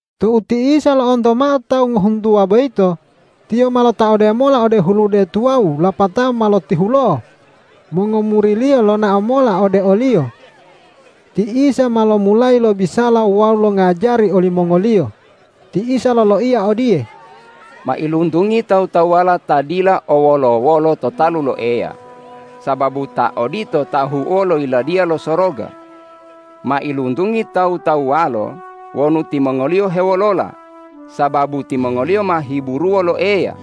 Tou ti Isa lo'onto mao tawu ngohuntuwa boyito, Tiyo ma lotaode mola ode hulude tuwawu lapatao ma lotihulo'o. Mongomuri-Liyo lonao mola ode o-Liyo. Ti Isa ma lomulayi lobisala wawu longajari olimongoliyo. Ti Isa loloiya odiye,”Mailuntungi tawu-tawuwala ta dila o wolo-wolo to talu lo Eya, sababu ta odito ta ahu'uwo lo Yiladiya lo Soroga. Mailuntungi tawu-tawuwalo wonu timongoliyo hewolola, sababu timongoliyo ma hiburuwo lo Eya.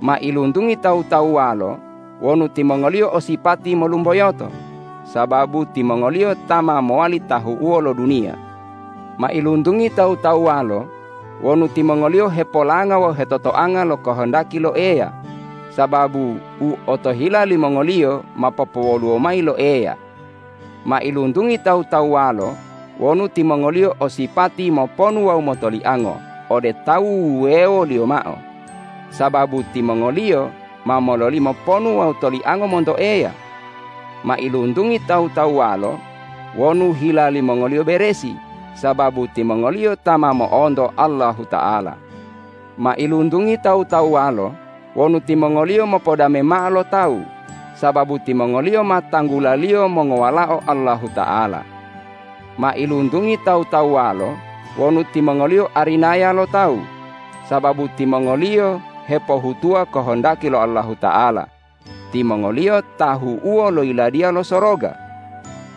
Mailuntungi tawu-tawuwalo wonu timongoliyo o sipati molumboyoto, sababu timongoliyo ta ma mowali tahu'uwo lo duniya. Mailuntungi tawu-tawuwalo wonu timongoliyo hepolanga wawu hetotoanga lo kohondaki lo Eya, sababu u otohila limongoliyo ma popowoluwo mayi lo Eya. Mailuntungi tawu-tawuwalo wonu timongoliyo o sipati moponu wawu motoliango ode tawu wuwewoliyo mao, sababu timongoliyo ma mololimo ponu wawu toliango monto Eya. Mailuntungi tawu-tawuwalo wonu hila limongoliyo beresi, sababu timongoliyo ta ma mo'onto Allahuta'ala. Mailuntungi tawu-tawuwalo wonu timongoliyo mopodame mao lo tawu, sababu timongoliyo ma tanggulaliyo mongowalao Allahuta'ala. Mailuntungi tawu-tawuwalo wonu timongoliyo arinaya lo tawu, sababu timongoliyo hepohutuwa kohondaki lo Allahuta'ala; timongoliyo tahu'uwo lo Yiladiya lo Soroga.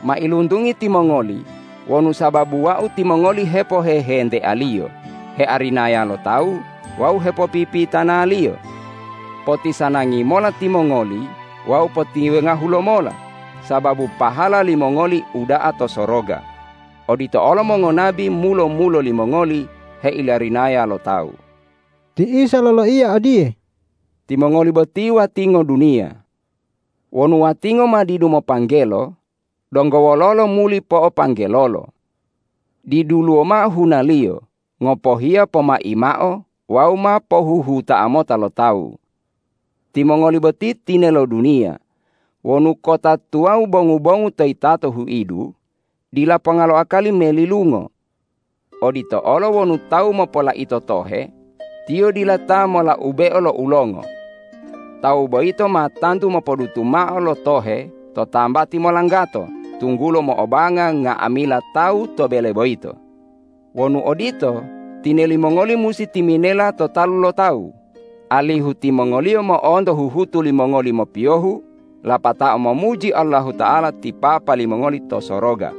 Mailuntungi timongoli wonu sababu Wau timongoli hepohehentealiyo, hearinaya lo tawu wawu hepopipitanaliyo. Potisanangi mola timongoli wawu potiwengahu lomola sababu pahala limongoli uda'a to soroga; odito olo mongonabi mulo-mulo limongoli heilarinaya lo tawu.” Ti Isa loloiya odiye,”Timongoli boti watingo duniya. Wonu watingo ma didu mopanggelo, donggo wololo muli po'opanggelolo? Diduluwo mao hunaliyo ngopohiya pomai mao wawu ma pohuhuta'a mota lo tawu. Timongoli boti tinelo duniya. Wonu kota tuwawu bongu-bongu to yitato huidu, dila ponga lo akali melilungo. Odito olo wonu tawu mopolaito tohe, tiyo dila ta molaubeo lo ulongo. Tawu boyito ma tantu mopodutu mao lo tohe to tambati molanggato tunggulo mo'obanga nga'amila tawu to bele boyito. Wonu odito, tineli mongoli musi timinela to talu lo tawu, alihu timongoliyo mo'onto huhutu limongoli mopiyohu lapatao momuji Allahuta'ala ti Papa limongoli to soroga.”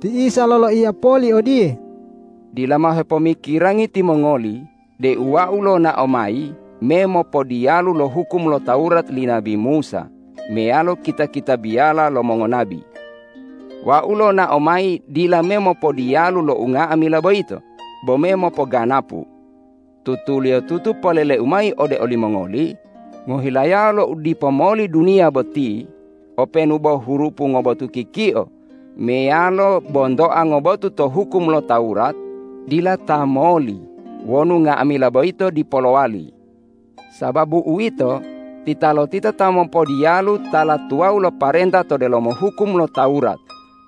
Ti Isa loloiya poli odiye,”Dila mao hepomikirangi timongoli deu Wau lonao mayi me mopodiyalu lo hukum lo Tawurat li nabi Musa meyalo kita-kitabiyala lo mongonabi. Wau lonao mayi dila me mopodiyalu lo unga'amila boyito, bo me mopoganapu. Tutuliyotutu polele-U mayi ode olimongoli: Ngohilayao lo udipo moli duniya boti openu bo hurupu ngobotu kikio meyalo bontoa ngobotu to hukum lo Tawurat dila ta moli wonu nga'amila boyito dipo lowali. Sababu uwito, titalotita ta mopodiyalu tala tuwawu lo parenta to delomo hukum lo Tawurat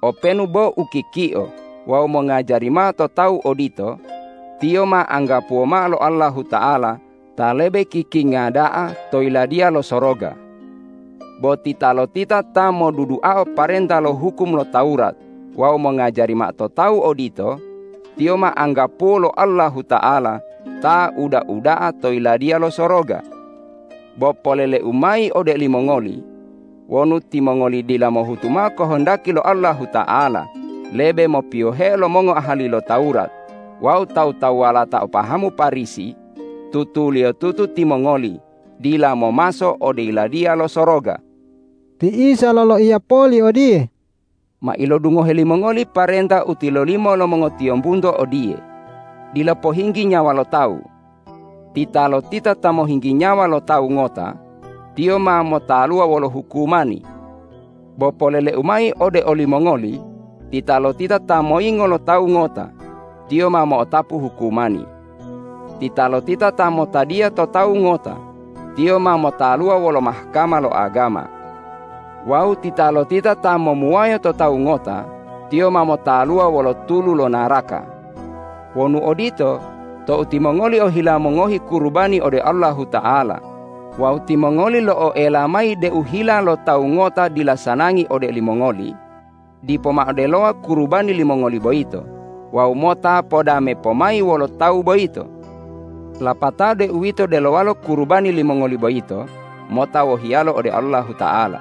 openu bo u kikio wawu mongajari mao to tawu odito, tiyo ma anggapuwo mao lo Allahuta'ala ta lebe kikinga da'a to Yiladiya lo Soroga. Bo titalotita ta moduduao parenta lo hukum lo Tawurat wawu mongajari mao to tawu odito, tiyo ma anggapuwo lo Allahuta'ala ta uda-uda'a to Yiladiya lo Soroga. Bo polele-U mayi ode olimongoli: Wonu timongoli dila mohutu mao kohondaki lo Allahuta'ala lebe mopiyoheo lo mongoahali lo Tawurat wawu tawu-tawuwala ta o pahamu Parisi, tutuliyotutu timongoli dila momaso ode Yiladiya lo Soroga.” Ti Isa loloiya poli odiye,”Ma ilodungohe limongoli parenta u tilolimo lo mongotiyombunto odiye, ’Dila pohinggi nyawa lo tawu. Titalotita ta mohinggi nyawa lo tawu ngota, tiyo ma motaluwa wolo hukumani.’ Bo polele-U mayi ode olimongoli: Titalotita ta moyingo lo tawu ngota, tiyo ma mo'otapu hukumani. Titalotita ta motadiya to tawu ngota, tiyo ma motaluwa wolo Mahkama lo agama. Wawu titalotita ta momuwayo to tawu ngota, tiyo ma motaluwa wolo tulu lo naraka. Wonu odito, tou timongoli ohila mongohi kurubani ode Allahuta'ala wawu timongoli lo'oela mayi deu hila lo tawu ngota dila sanangi ode olimongoli, dipo mao delowa kurubani limongoli boyito wawu mota podame pomayi wolo tawu boyito. Lapatao deuwito delowalo kurubani limongoli boyito mota wohiyalo ode Allahuta'ala.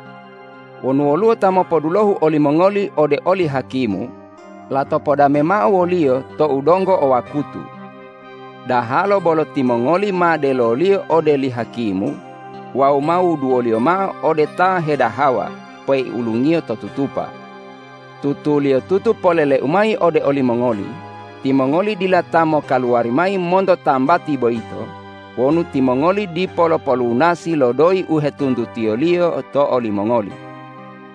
Wonu woluwo ta mopodulohu olimongoli ode oli hakimu, lato podame mao woliyo tou donggo o wakutu. Dahalo bolo timongoli ma deloliyo ode li hakimu wawu ma wuduwoliyo mao ode ta hedahawa peiulungiyo to tutupa. Tutuliyotutu polele-U mayi ode olimongoli: Timongoli dila ta mokaluwari mayi monto tambati boyito wonu timongoli dipo lopolunasi lo doyi u hetuntutiyoliyo to olimongoli.”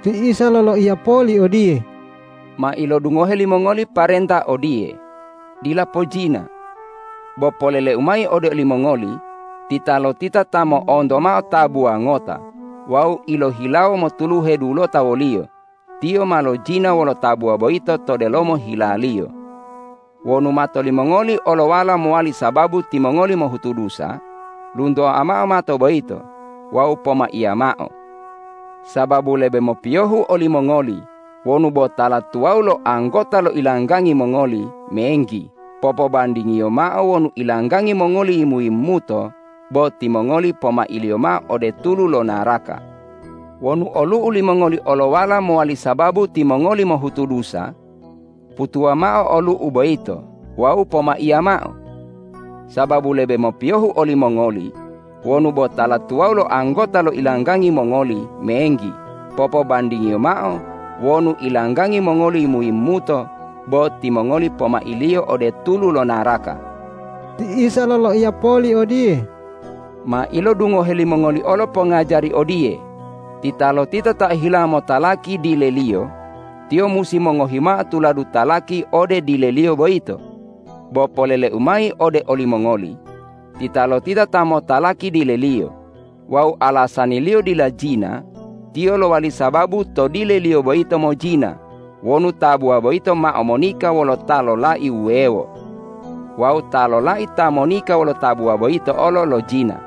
Ti Isa loloiya poli odiye,”Ma ilodungohe limongoli parenta odiye, ’Dila pojina.’ Bo polele-U mayi ode olimongoli: Titalotita ta mo'onto mao tabuwa ngota wawu ilohilawo motuluhe dulota woliyo, tiyo ma lojina wolo tabuwa boyito to delomo hilaliyo. Wonu mato limongoli olowala mowali sababu timongoli mohutu dusa, luntoa mao mato boyito wawu pomaiya mao. Sababu lebe mopiyohu olimongoli wonu bo tala tuwawu lo anggota lo ilanggangi mongoli menggi popobandingiyo mao wonu ilanggangi mongoli yimu-yimumuto bo timongoli pomailiyo mao ode tulu lo naraka. Wonu olu'u limongoli olowala mowali sababu timongoli mohutu dusa, putuwa mao olu'u boyito wawu pomaiya mao. Sababu lebe mopiyohu olimongoli wonu bo tala tuwawu lo anggota lo ilanggangi mongoli menggi popobandingiyo mao wonu ilanggangi mongoli yimu-yimumuto bo timongoli pomailiyo ode tulu lo naraka.” Ti Isa loloiya poli odiye,”Ma ilodungohe limongoli olo pongajari odiye, ’Titalotita ta ohila motalaki dileliyo, tiyo musi mongohi mao tuladu talaki ode dileliyo boyito.’ Bo polele-U mayi ode olimongoli: Titalotita ta motalaki dileliyo wawu alasaniliyo dila jina, tiyo lowali sababu to dileliyo boyito mojina wonu tabuwa boyito mao monika wolo ta lolai wuwewo. Wawu ta lolai ta monika wolo tabuwa boyito olo lojina.”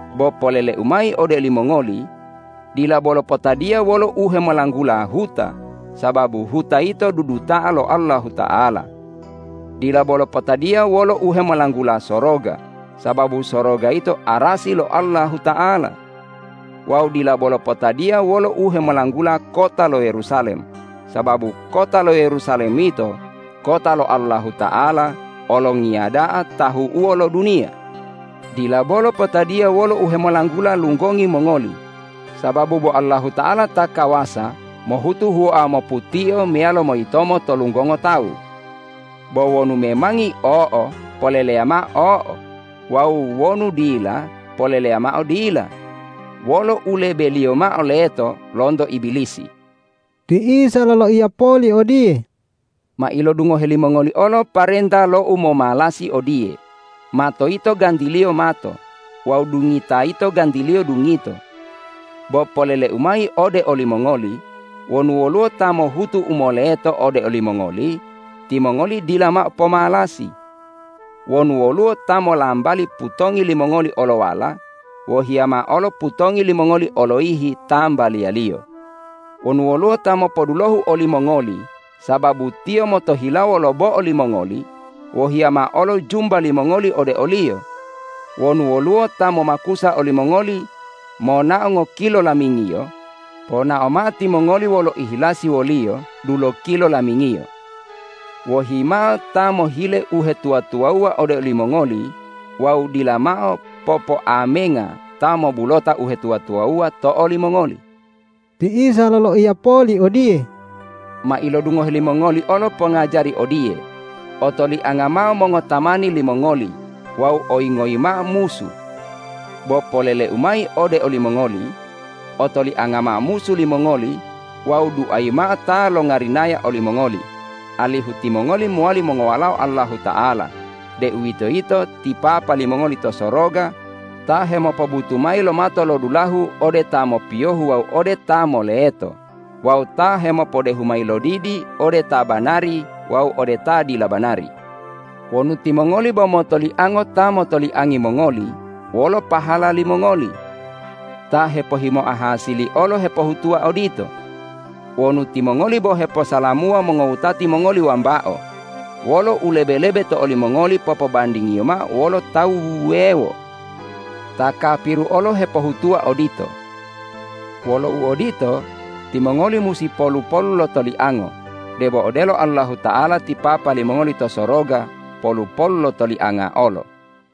Bo polele-U mayi ode olimongoli: Dila bolo potadiya wolo uhemolanggula huta, sababu huta yito duduta'a lo Allahuta'ala. Dila bolo potadiya wolo uhemolanggula soroga, sababu soroga yito arasi lo Allahuta'ala. Wawu dila bolo potadiya wolo uhemolanggula kota lo Yerusalem, sababu kota lo Yerusalem yito kota lo Allahuta'ala Olongiya da'a tahu'uwo lo duniya. Dila bolo potadiya wolo uhemolanggula lunggongi mongoli, sababu bo Allahuta'ala ta kawasa mohutu huwoa moputio meyalo moyitomo to lunggongo tawu. Bo wonu memangi o'o, poleleya mao o'o; wawu wonu dila, poleleya mao dila. Wolo u lebeliyo mao leto lonto Ibilisi.” Ti Isa loloiya poli odiye,”Ma ilodungohe limongoli olo parenta lo umomalasi odiye, ’Mato yito gantiliyo mato wawu dungita yito gantiliyo dungito.’ Bo polele-U mayi ode olimongoli: Wonu woluwo ta mohutu u moleto ode olimongoli, timongoli dila mao pomalasi. Wonu woluwo ta molambali putongi limongoli olowala, wohiya mao olo putongi limongoli oloyihi tambaliyaliyo. Wonu woluwo ta mopodulohu olimongoli sababu tiyo motohilawo lo bo'o limongoli, wohiya mao olo jumba limongoli ode oliyo. Wonu woluwo ta momakusa olimongoli monao ngokilo lamingiyo, ponao mao timongoli wolo ihilasi woliyo dulokilo lamingiyo. Wohi mao ta mohile uhetuwa-tuwawuwa ode olimongoli wawu dila mao popoamenga ta mobulota uhetuwa-tuwawuwa to olimongoli.” Ti Isa loloiya poli odiye,”Ma ilodungohe limongoli olo pongajari odiye, ’Otolianga mao mongotamani limongoli wawu oyingoyi mao musu.’ Bo polele-U mayi ode olimongoli: Otolianga mao musu limongoli wawu duayi mao ta longarinaya olimongoli, alihu timongoli mowali mongowalao Allahuta'ala, deuwitoyito ti Papa limongoli to soroga ta hemopobutu mayi lo matolodulahu ode ta mopiyohu wawu ode ta moleto wawu ta hemopodehu mayi lodidi ode ta banari wawu ode ta dila banari. Wonu timongoli bo motoliango ta motoliangi mongoli, wolo pahala limongoli? Ta hepohimoa hasili olo hepohutuwa odito. Wonu timongoli bo heposalamuwa mongowutati mongoli wambao, wolo u lebe-lebe to olimongoli popobandingiyo mao wolo tawu wuwewo? Ta kapiru olo hepohutuwa odito. Wolo uodito, timongoli musi polu-polu lo toliango debo odelo Allahuta'ala ti Papa limongoli to soroga polu-polu lo tolianga olo.”